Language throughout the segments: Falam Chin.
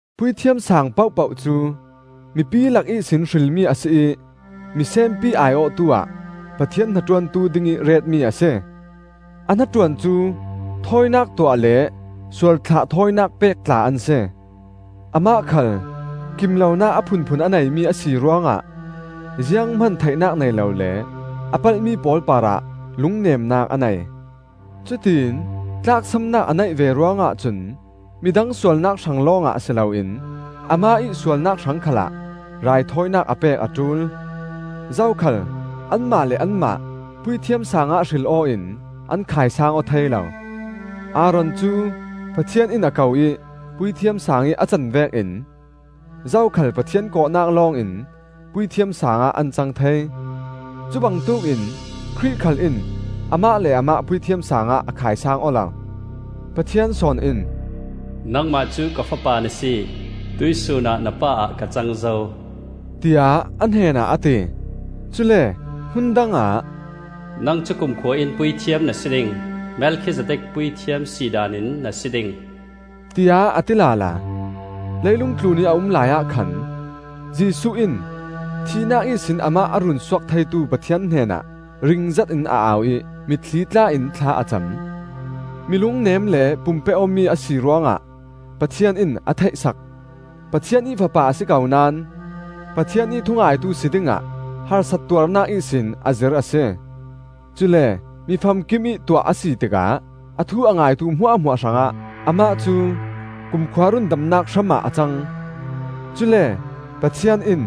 Puithiam Sang pohpoh cu mipi lak ihsin hrilmi a si ih misenpi ai-awhtu ah Pathian hnaṭuantu dingih retmi a si. A hnaṭuan cu thawinak tuah le sualthlah thawinak pek tla an si. Amah khal kim lonak a phunphun a neimi a si ruangah zianghman theihnak nei lo le a palhmi pawl parah lungnemnak a nei. Cutiin tlaksamnak a neih ve ruangah cun midang sualnak hrang lawngah si loin amah ih sualnak hrang khalah raithawinak a pek a ṭul. Zokhal anmah le anmah Puithiam Sangah hril aw in an khaisaang aw thei lo. Aaron cu Pathian in a ko ih Puithiam Sang ih a can vekin zokhal Pathian kawhnak lawngin Puithiam Sangah an cang thei. Cubangtuk in Khrih khal in amah le amah Puithiam saangah a khaisaang aw lo. Pathian sawn in, “Nangmah cu ka Fapa na si, tuihsun ah na Pa ah ka cang zo,” tiah a hnenah a ti. Cule hmun dangah, “Nang cu kumkhua in Puithiam na si ding; Melkhizedek puithiam si daan in na si ding,” tiah a ti lala. Leilung tlunih a um laiah khan Jesuh in thihnak ihsin amah a runsuak theitu Pathian hnenah ringzet in a au ih mitthli tla-in thla a cam. Mi lungnem le pum pe-awmi a si ruangah Pathian in a theih sak. Pathian ih Fapa a si ko naón Pathian ih thungaitu si dingah harsat tuarnak ihsin a zir a si. Cule mi famkimih tuah a si tikah a thu a ngaitu hmuahhmuah hrangah amah cu kumkhua rundamnak hramah a cang; cule Pathian in,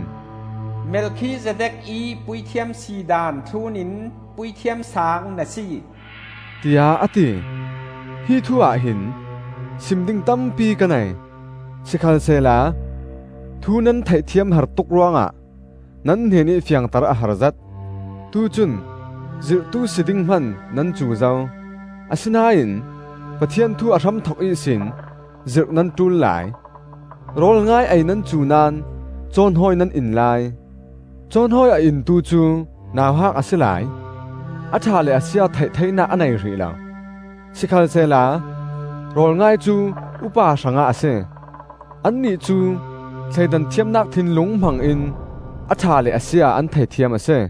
“Melkhizedek ih puithiam si daan thlun in Puithiam Saang na si,” tiah a ti. Hi thu ahhin sim ding tampi ka nei; sikhalsehla thu nan theihthiam har tuk ruangah nan hnenih fiangter a harzet. Tucun zirhtu si ding hman nan cu zo; asinain Pathian thu a hramthok ihsin zirh nan ṭul lai. Rawl ngai ei nan cu naón cawhnawi nan in lai. Cawhnawi a intu cu nauhak a si lai; a ṭha le a sia theih theinak a nei hrih lo. Sikhalsehla rawl ngai cu upa hrangah a si; annih cu thleidan thiamnak thinlung hmangin a ṭha le a sia an theithiam a si.